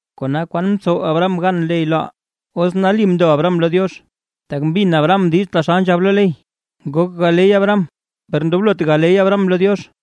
Kona, ¿kwan mtsow Abraham gan ley loʼaa? Os nali mndo Abraham lo Diox, tak mbin Abraham diiz taxal nzhab lo ley, ngok galey Abraham, per ndoblot galey Abraham lo Diox.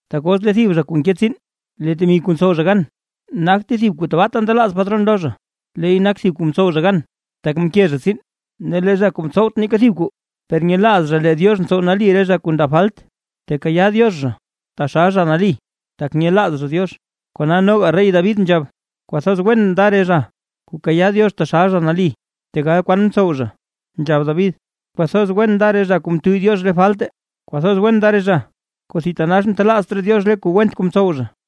Tak os lee thib zha kuu nke tsiin, lee temi kuu ntsow zha gan nagte thib kuu tabaata ndelaaz patron zha lo zha, leey nak thib kuu mtsow zha gan, tak mke zha tsiin. Ne lee zha kuu mtsowt neeka thib kuu, per nyelaaz zha lee Diox ntsow nali re zha kuu ndab falt, tekayaa Diox zha taxal zha nali, tak nyelaaz zha Diox. Kona noga rey David nzhab, kwathoz wen nda re zha kuu kayaa Diox zha taxal zha nali tegal kwan mtsow zha. Nzhab David: Kwathoz wen nda re zha kuu mtuyy Diox re falte; kwathoz wen nda re zha kuu thitanax mtelaazt raa Diox re kuu went kuu mtsow zha.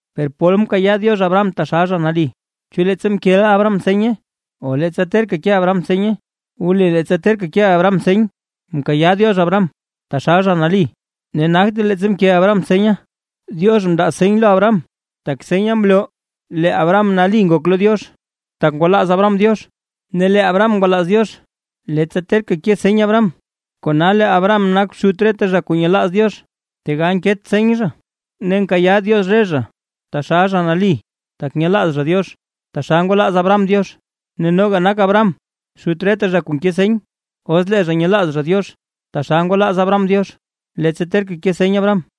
Per, ¿pol mkayaa Diox Abraham taxal zha nali? ¿Chu leettsa mkeʼa Abraham seny o leettsa terka ke seny Abraham? Wli leettsa terka ke seny Abraham mkayaa Diox Abraham taxal zha nali, ne nagte leettsa mke Abraham seny. Diox mndaa seny lo Abraham, tak senya mloo lee Abraham nali ngok lo Diox, tak ngwalaaz Abraham Diox. Ne lee Abraham ngwalaaz Diox, leettsa terka ke seny Abraham, kona lee Abraham nak xut reta zha kuu nyelaaz Diox, tegal nket seny zha. Ne nkayaa Diox re zha taxal zha nali, tak nyelaaz zha Diox, taxal ngwalaaz Abraham Diox. Ne noga nak Abraham xut reta zha kuu nke seny, os lee zha nyelaaz zha Diox taxal ngwalaaz Abraham Diox, leettsa terka ke seny Abraham.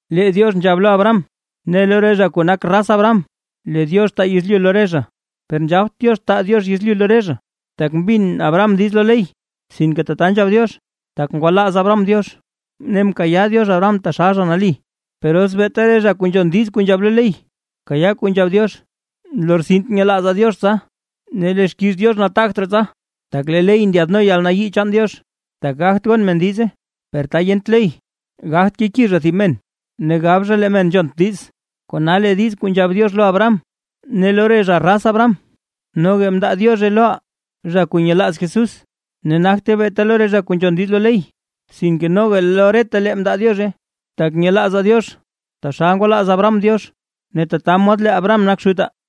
Lee Diox nzhab lo Abraham ne lo re zha kuu nak raz Abraham, lee Diox taa yezlyu lo re zha. Per nzhabt Diox taa Diox yezlyu lo re zha, tak mbin Abraham diiz lo ley, sinke tata nzhab Diox, tak ngwalaaz Abraham Diox; ne mkayaa Diox Abraham taxal zha nali. Per os beeta re zha kuu nzhon diiz kuu nzhab lo ley kayaa kuu nzhab Diox, nlortsint nyelaazaa Diox tsa, ne lee xkiiz Diox nataagt raa tsa. Tak lee ley ndyaadno yalnayii chaan Diox, tak gagt gon men diize; per ta yent ley gagt keki zha thib men, ne gab zha lee men nzhont diiz. Kona lee diiz kuu nzhab Diox lo Abraham ne lo re zha raz Abraham, noga mndaa Diozhe loʼaa, zha kuu nyelaaz Jesús. Ne nagte beeta lo re zha kuu nzhon diiz lo ley, sinke noga lo retalee mndaa Diozhe, tak nyelaazaa Diox taxal ngwalaaz Abraham Diox. Ne tata mod lee Abraham nak xutaa.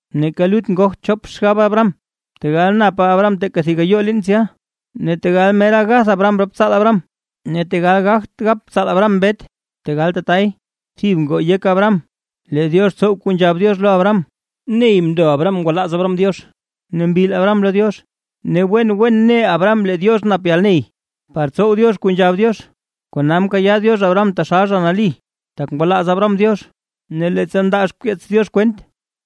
Neeka lut ngogt chop xgab Abraham, tegal napa Abraham teeka thib gayoo liin tsya; ne tegal mera gath rop tsaalta Abraham tsya ne tegal gagt gap tsaal Abraham mbet. Tegal tatay, thib ngoo yek Abraham, lee Diox tsow kuu nzhab Diox lo Abraham. Ney mndo Abraham ngwalaaz Abraham Diox ne mbil Abraham lo Diox. Ne wen wen ne Abraham lee Diox nap yalney, par tsow Diox kuu nzhab Diox. Kona mkayaa Diox Abraham taxal zha nali, tak ngwalaaz Abraham Diox. Ne leettsa ndaa xkeets Diox kwent,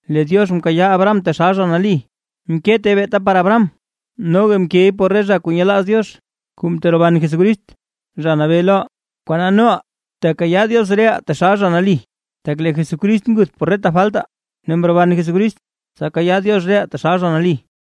lee Diox mkayaa Abraham taxal zha nali, mkete beeta por Abraham; noga mkey por re zha kuu nyelaaz Diox kuu mteroban Jesucrist, Zha Nabee loʼaa, kona noʼaa tekayaa Diox reʼaa taxal zha nali, tak lee Jesucrist nguth por reta faltaa, ne mroban Jesucrist tsa kayaa Diox reʼaa taxal zha nali.